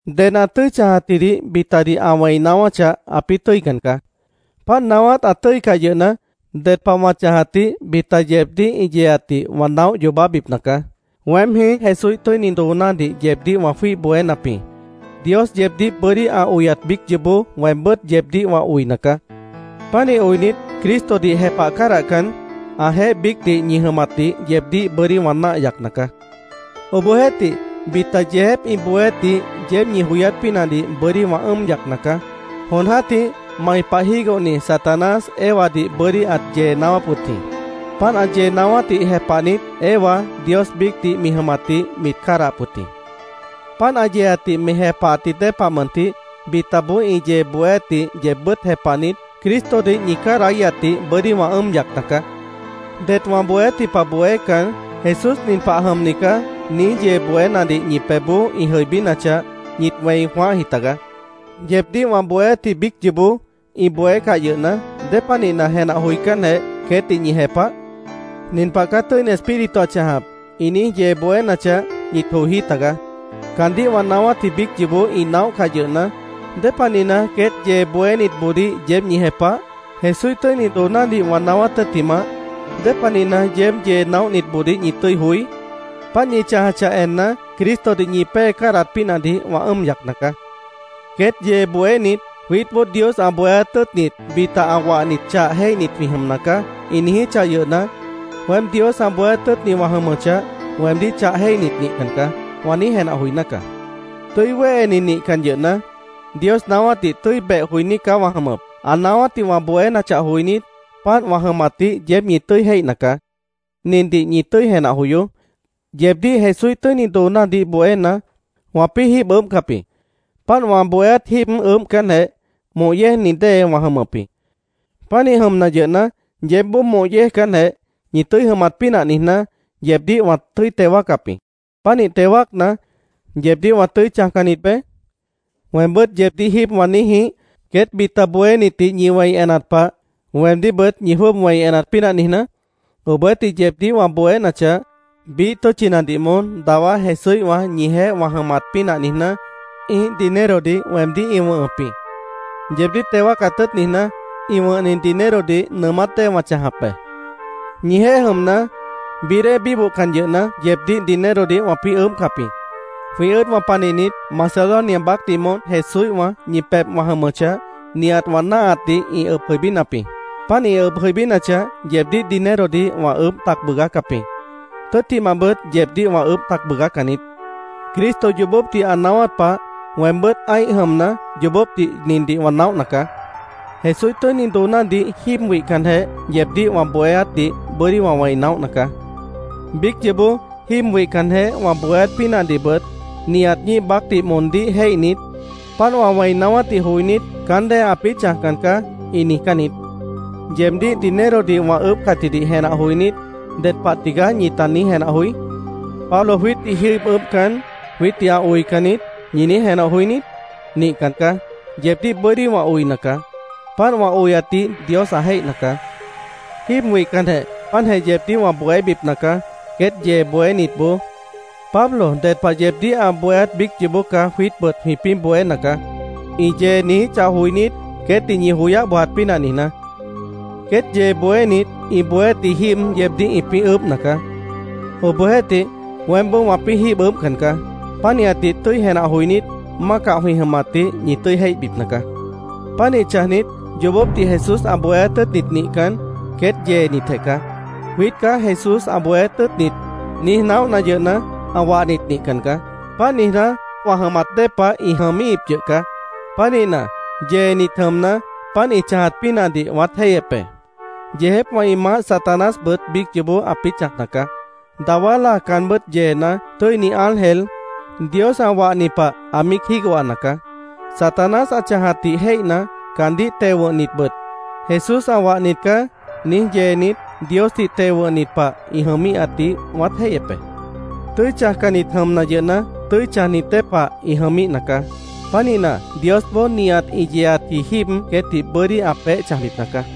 Ded ã tʉ́i chãjatjidih bitadih ã wẽi naáwáchah, ãpĩ́ tʉ́ican caá. Páant naáwát ã tʉ́icah yʉhna, ded pah wã chãjatdih bita yeebdíh ĩ yeeatdih wã naóh yoobábipna caá. Weém jĩí Jesúíh tʉ́ini doonádih yeebdíh wã jwíih bohénap jĩ. Dios yeebdíh bʉ́dí ã oyat biíc yoobó weembʉ́t yeebdíh wã oina caá. Pánih oinit, Cristodih jepah cádahcan, ãjeéh biícdih ñi jʉmatdih yeebdíh bʉ́dí wã náah yacna caá. Obohjeéhtih, bita yeejép ĩ bohéátdih yeéb ñi joyát pínahdih bʉ́dí wã ʉ́ʉm yacna caá. Jon jã́tih mai pah jígohni Satanás Evadih bʉ́dí ãt yee naáwáp wʉt jĩ. Páant ã yee naáwátdih jepahnit, Eva Dios biícdih mi jʉmatdih mit cádahap wʉt jĩ. Páant ã yeeatdih mi jepahatji dée pah mʉntih, bitaboó ĩ yee bohéátdih yeebbʉ́t jepahnit, Cristodih ñi cádahíhatdih bʉ́dí wã ʉ́ʉm yacna caá. Det wã bohéátji pah bohécan, “Jesús nin pah jʉmni caá”, niíj yee bohénadih ñi pebhboó ĩ jʉibínachah, ñit wẽi jwãáhji tagaá. Yeebdíh wã bohéátji biíc yoobó ĩ bohécah yʉhna, ¿dépanihna jenah joicánjeh, queétdih ñi jepah? “Nin pah caá Tʉ́ini Espíritu ã chãjap”, ĩ niíj yee bohénachah, ñit joijí tagaá. Caandíh wã naáwátji biíc yoobó ĩ naóhcah yʉhna, ¿Dépanihna queét yee bohénitboodíh yeéb ñi jepah? Jesúíh tʉ́ini doonádih wã naáwát tʉ́ttimah, ¿Dépanihna yeéb yee naóhnitboodíh ñi tʉ́i joí? Páant ñi chãjachah enna, Cristodih ñi pée cádahat pínahdih wã ʉ́ʉm yacna caá. Queét yee bohénit “Jwiítboó Dios ã bohéát tʉ́ʉtnit bita ã wahnit chah jéihnit jwĩ jʉmna caá”, ĩ niijíchah yʉhna, “Weém Dios ã bohéát tʉ́ʉtni wã jʉmʉchah, weemdíh chah jéihnit nihcan caá”, wã niíj jenah joiná caá. Tʉ́i wéheni nihcan yʉhna, Dios naáwátdih tʉ́i beh joiní caá wã jʉmʉp. Ã naáwátdih wã bohénachah joinít, páant wã jʉmatdih yeéb ñi tʉ́i jéihna caá. Nindih ñi tʉ́i jenah joyoó: Yeebdíh Jesúíh tʉ́ini doonádih bohéna, wãpĩ́ jíib ʉʉ́bhcap jĩ. Páant wã bohéát jíib ʉʉ́bhcanjeh, moh yéejni dée wã jʉmʉp jĩ. Pánih jʉmna yʉhna, yeébboó moh yéejcanjeh, ñi tʉ́i jʉmat pínah niijná, yeebdíh wã tʉ́i teo wáacap jĩ. Pánih teo wáacna, ¿yeebdíh wã tʉ́i chãjcannit beé? ¿Weembʉ́t yeebdíh jíib wã niíj jĩíh, queét bita bohénitdih ñi wẽi enat pah, weemdíhbʉt ñi jwʉ́ʉb wẽi enat pínah niijná? Obohjeéhtih, yeebdíh wã bohénachah, biíh tʉ́tchinadih moón dawá Jesúíhwã ñijeéh wã jʉmat pínah niijná, ĩ́ih dinerodih weemdíh ĩ wʉ̃hʉp jĩ. Yeebdíh teo wáacat tʉ́ʉt niijná, ĩ wʉ̃hni dinerodih nʉʉmát dée wã chãjap be. Ñijeéh jʉmna, bií dée bíbohcan yʉhna, yeebdíh dinerodih wãpĩ́ ʉʉ́bhcap jĩ. Jwĩ ʉ́ʉdwã panihnit Macedonia baácdih moón Jesúíhwã ñi pebh wã jʉmʉchah, nihat wã náahatdih ĩ ʉb jʉibínap jĩ. Páant ĩ ʉb jʉibínachah, yeebdíh dinerodih wã ʉʉ́bh tac bʉʉgácap jĩ. Tʉ́ttimahbʉt, yeebdíh wã ʉʉ́bh tac bʉʉgácan niít. Cristo yoobópdih ã naáwát pah, weembʉ́t ã́ih jʉmna, yoobópdih nindih wã naóhna caá: Jesúíh tʉ́ini doonádih jíib wihcanjeh yeebdíh wã bohéátdih bʉ́dí wã wẽi naóhna caá. Biíc yoobó jíib wihcanjeh wã bohéát pínahdihbʉt nihat ñíih baácdih moondíh jéihnit, páant wã wẽi naáwátdih joinít, “Caán dée ãpĩ́ chãjcan caá”, ĩ niijcán niít. Yeebdíh dinerodih wã ʉʉ́bhcatjidih jenah joinít, ¿ded pah tigaá ñita niíj jenah joí? “Pablo jwiítdih jíib ʉʉ́bhcan, jwiítdih ã oican niít”, ¿ñi niíj jenah joí niít? Nihcan caá. Yeebdíh bʉ́dí wã oina caá. Páant wã oyatdih Dios ã jéihna caá. Jíib wihcanjeh páantjeh yeebdíh wã bohébipna caá, queét yee bohénitboó “Pablo ded pah yeebdíh ã bohéát biíc yoobó caá jwiítbʉt jwĩpĩ́ bohéna caá”, ĩ yee niijíchah joinít, queétdih ñi joyáh bojat pínah niijná. Queét yee bohénit ĩ bohéátji jíib yeebdíh ĩpĩ́ ʉʉ́bhna caá. Obohjeéhtih, weémboó wãpĩ́ jíib ʉʉ́bhcan caá. Pánihatdih tʉ́i jenah joinít, mácah jwĩ jʉmatdih ñi tʉ́i jéihbipna caá. Pánih chãjnit yoobópdih Jesús ã bohéát tʉ́ʉtnit nihcan, queét yeenitjeh caá. “Jwiít caá Jesús ã bohéát tʉ́ʉtnit”, niíj naóhna yʉhna, ã wahnit nihcan caá. Páant niijná, wã jʉmat dée pah ĩ jʉmíhip yʉh caá. Pánihna, yeenit jʉmna, páant ĩ chãjat pínahdih wãát jéihyep be. Yeejépwã ĩ maáh Satanásbʉt biíc yoobó ãpĩ́ chãjna caá. Dawá láa caanbʉ́t yeena, tʉ́ini ángel, Dios ã wahni pah ã míic jígohana caá. Satanás ã chãjatdih jéihna, caandíh teo wʉ̃hnitbʉt “Jesús ã wahnit caá”, niíj yeenit, Diosdih teo wʉ̃hnit pah ĩ jʉmíhatdih wãát jéihyep be. Tʉ́i chãjcannit jʉmna yʉhna, tʉ́i chãjnit dée pah ĩ jʉmíhna caá. Pánihna, Diosboó nihat ĩ yeeatji jíib queétdih bʉ́dí ã peéh chãjbipna caá.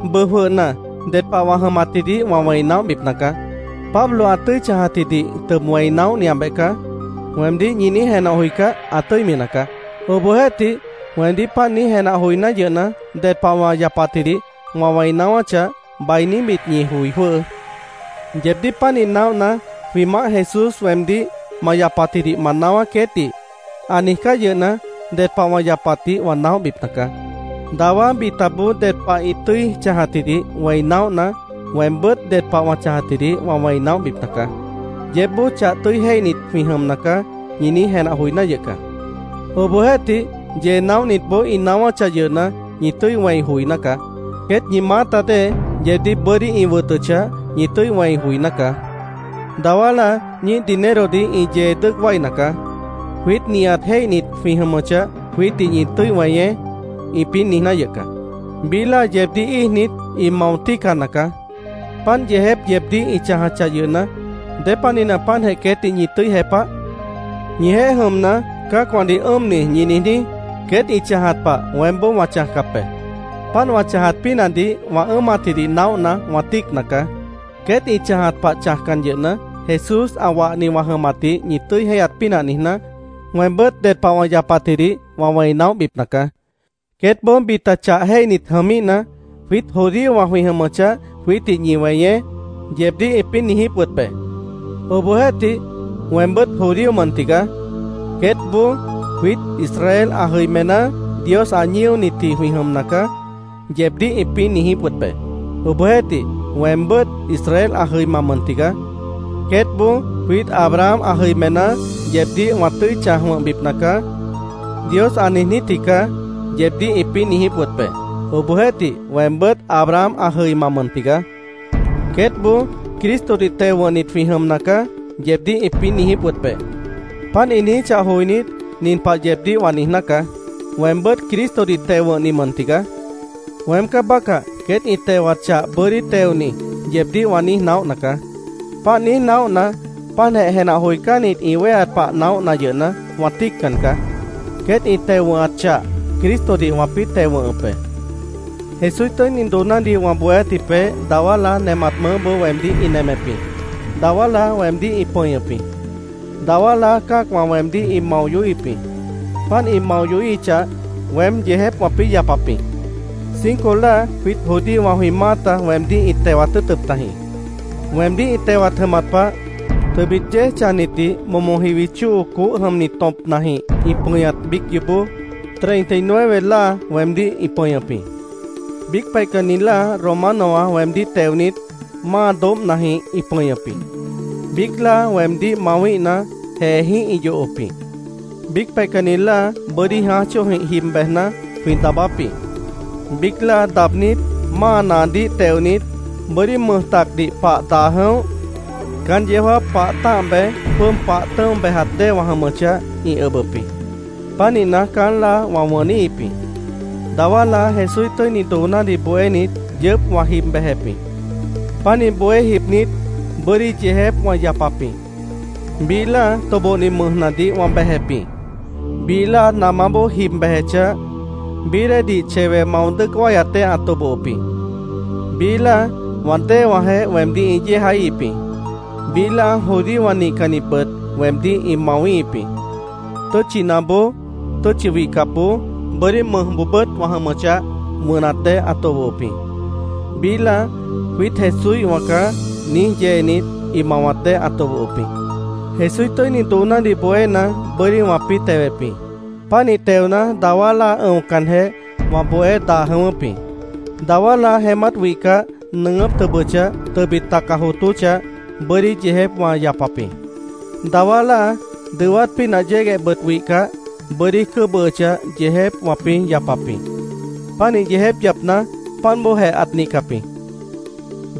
Bʉʉ jwʉhna, ded pah wã jʉmatjidih wã wẽi naóhbipna caá. “Pablo ã tʉ́i chãjatjidih tʉb wẽi naóhniabeh caá”, weemdíh ñi niíj jenah joicáh, ã tʉ́imi nacaá. Obohjeéhtih, weemdíh páant niíj jenah joiná yʉhna, ded pah wã yapatjidih wã wẽi naáwáchah, bainíbit ñi joi jwʉ́hʉʉ́. Yeebdíh pánih naóhna, jwĩ Maáh Jesús weemdíh “Ma yapatjidih ma naáwá queétdih”, ã niijcáh yʉhna, ded pah wã yapatdih wã naóhbipna caá. Dawá bitaboó ded pah ĩ tʉ́i chãjatjidih wẽi naóhna, weembʉ́t ded pah wã yapatjidih wã wẽi naóhbipna caá. Yeébboó “Chah tʉ́i jéihnit jwĩ jʉmna caá”, ñi niíj jenah joiná yʉh caá. Obohjeéhtih, yee naóhnitboó ĩ naáwáchah yʉhna, ñi tʉ́i wẽi joiná caá. Queét ñi maáta dée, yeebdíh bʉ́dí ĩ wʉtʉchah, ñi tʉ́i wẽi joiná caá. Dawá láa ñíih dinerodih ĩ yee dʉ́ʉc wáina caá. “Jwiít nihat jéihnit jwĩ jʉmʉchah, jwiítdih ñi tʉ́i weñeé”, ĩpĩ́ niijná yʉh caá. Biíh láa yeebdíh íijnit, ĩ mao tíicana caá. Páant yeejép yeebdíh ĩ chãjachah yʉhna, ¿Dépanihna páantjeh queétdih ñi tʉ́i jepah? Ñijeéh jʉmna, “cã́acwãdih ʉ́ʉmni”, ñi niijní, queét ĩ chãjat pah weémboó wã chãjcap be. Páant wã chãjat pínahdih wã ʉ́ʉmatjidih naóhna, wã tíicna caá. Queét ĩ chãjat pah chãjcan yʉhna, Jesús ã wahni wã jʉmatdih ñi tʉ́i jéihyat pínah niijná, weembʉ́t ded pah wã yapatjidih wã wẽi naóhbipna caá. Queétboó bita chah jéihnit jʉmíhna, “Jwiít judíowã jwĩ jʉmʉchah, jwiítdih ñi weñeé”, yeebdíh ĩpĩ́ niijíp wʉt be. Obohjeéhtih, weembʉ́t judío mʉn tigaá. Queétboó “Jwiít Israel ã jʉimená, Dios ã ñíonitji jwĩ jʉmna caá”, yeebdíh ĩpĩ́ niijíp wʉt be. Obohjeéhtih, weembʉ́t Israel ã jʉima mʉn tigaá. Queétboó “Jwiít Abraham ã jʉimená, ‘Yeebdíh wã tʉ́i chãj wʉ̃hbipna caá’, Dios ã niijnítji caá”, yeebdíh ĩpĩ́ niijíp wʉt be. Obohjeéhtih, weembʉ́t Abraham ã jʉima mʉn tigaá. Queétboó “Cristodih teo wʉ̃hnit jwĩ jʉmna caá”, yeebdíh ĩpĩ́ niijíp wʉt be. Páant ĩ niijíchah joinít, nin pah yeebdíh wã niijná caá: “Weembʉ́t Cristodih teo wʉ̃hni mʉn tigaá. Weém caá bácah queét ĩ tewat chah bʉ́dí teoni”, yeebdíh wã niíj naóhna caá. Páant niíj naóhna, páantjeh jenah joicánnit ĩ wéheat pah naóhna yʉhna, wã tíiccan caá. Queét ĩ teo wʉ̃hat chah Cristodih wãpĩ́ teo wʉ̃hʉp be. Jesúíh tʉ́ini doonádih wã bohéátji peéh dawá láa nemat mʉʉ́boó weemdíh ĩ nemep jĩ. Dawá láa weemdíh ĩ pʉñʉp jĩ. Dawá láa cã́acwã weemdíh ĩ mao yohíhip jĩ. Páant ĩ mao yohíhichah, weém yeejép wãpĩ́ yapap jĩ. Cinco láa jwiít judíowã jwĩ maáta weemdíh ĩt tewat tʉ́ʉtʉp tajĩ. Weemdíh ĩ tewat jʉmat pah, tʉbit yéej chãjnitdih momo jiwi chóo coóh jʉmni tõpnajĩh ĩ pʉñat biíc yoobó treinta y nueve láa weemdíh ĩ pʉñʉp jĩ. Biíc peihcanni láa Romanowã weemdíh teonit, máa doóbhnajĩh ĩ pʉñʉp jĩ. Biíc láa weemdíh mawíhna, jeejĩ́h ĩ yohop jĩ. Biíc peihcanni láa bʉ́dí jãáj chóojĩh jib bejna, jwĩ daabáp jĩ. Biíc láa daabnít, máa naadíh teonit, bʉ́dí mʉj tacdih pah daa jʉ̃óh, caán yeó jáap pah tã́ah bej, jwʉ́ʉb pah tʉ̃́o bejat dée wã jʉmʉchah, ĩ ʉbʉp jĩ. Pánihna, caán láa, wã wʉníhip jĩ. Dawá láa Jesúíh tʉ́ini doonádih bohénit, yʉʉ́p wã jib bejep jĩ. Pánih bohé jibnit, bʉ́dí yeejép wã yapap jĩ. Biíh láa tobohni mʉjnadih wã bejep jĩ. Biíh láa namáboó jib bejechah, bií déedih chewe mao dʉ́ʉc wáyat dée ã tobohop jĩ. Biíh láa wã déewãjeh weemdíh ĩ yéejaíhip jĩ. Biíh láa judíowã nihcannitbʉt weemdíh ĩ mawíhip jĩ. Tʉ́tchinaboó, tʉ́tchi wihcapboó, bʉ́dí mʉjboobʉ́t wã jʉmʉchah, wʉnat dée ã tobohop jĩ. Biíh láa “Jwiít Jesúíhwã caá”, niíj yeenit, ĩ mawat dée ã tobohop jĩ. Jesúíh tʉ́ini doonádih bohéna, bʉ́dí wãpĩ́ tewep jĩ. Pánih teona, dawá láa ʉ̃ocanjeh wã bohé daa jʉ̃ʉ́wʉ́p jĩ. Dawá láa jeémát wihcah, nʉʉgʉ́p tʉbʉchah, tʉbit taca jootóchah, bʉ́dí yeejép wã yapap jĩ. Dawá láa dʉwát pínah yéguehbʉt wihcah, bʉ́dí cʉ́bʉhʉchah, yeejép wãpĩ́ yapap jĩ. Pánih yeejép yapna, páant bóojeh ãt nihcap jĩ.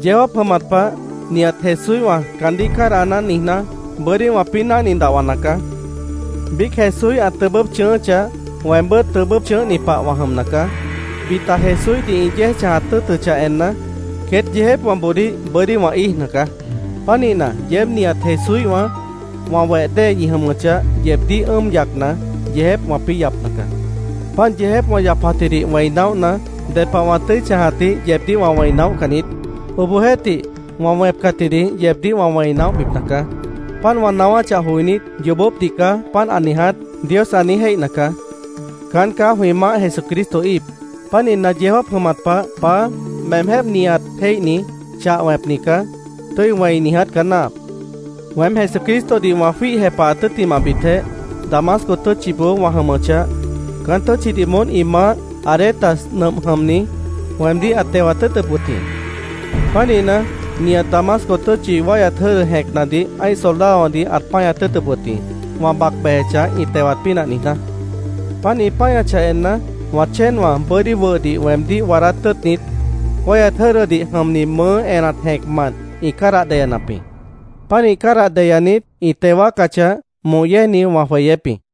Yeó jáap jʉmat pah nihat Jesúíhwã “caandíh cádahná”, niijná, bʉ́dí wãpĩ́ náhni dahwana caá. Biíc Jesúíh ã tʉbʉ́p chʉ̃ʉ́ʉ́chah, weembʉ́t tʉbʉ́p chʉ̃ʉ́hni pah wã jʉmna caá. Bita Jesúíhdih ĩ yéej chãjat tʉ́ʉtʉchah enna, queét yeejépwãboodíh bʉ́dí wã íijna caá. Pánihna, yeéb nihat Jesúíhwã, wã weh dée ñi jʉmʉchah, yeebdíh ʉ́ʉm yacna, yeejép wãpĩ́ yapna caá. Páant yeejép wã yapatjidih wẽi naóhna, ded pah wã tʉ́i chãjatdih yeebdíh wã wẽi naóhcan niít. Obohjeéhtih, wã wẽpcatjidih yeebdíh wã wẽi naóhbipna caá. Páant wã naáwáchah joinít, “Yoobópdih caá páant ã niiját”, Dios ã niíj jéihna caá. Caán caá jwĩ Maáh Jesucristo íip. Pánihna, yeó jáap jʉmat pah “Paá, meemjéh nihat jéihni, chah wẽpni caá”, tʉ́i wẽi niiját caá náahap. Weém Jesucristodih wã jwíih jepahat tʉ́ttimahbitjeh, Damasco tʉ́tchiboó wã jʉmʉchah, caán tʉ́tchidih moón ĩ maáh, Aretas nʉmp jʉmni, weemdíh ãt tewat tʉ́ʉtʉp wʉt jĩ. Pánihna, nihat Damasco tʉ́tchi wáihyat jʉ́dʉ jẽcnadih ã́ih soldadowãdih ãt páñat tʉ́ʉt wʉt jĩ, wã bac bejechah ĩ tewat pínah niijná. Páant ĩ páñachah enna, wã chéenwã bʉ́dí wʉhdih weemdíh waadát tʉ́ʉtnit, wáihyat jʉ́dʉdih jʉmni mʉʉ́ enat jẽcmant ĩ cádah deyanap jĩ. Pánih cádah deyanit, ĩ teo wáacachah, moh yéejni wã jweyép jĩ.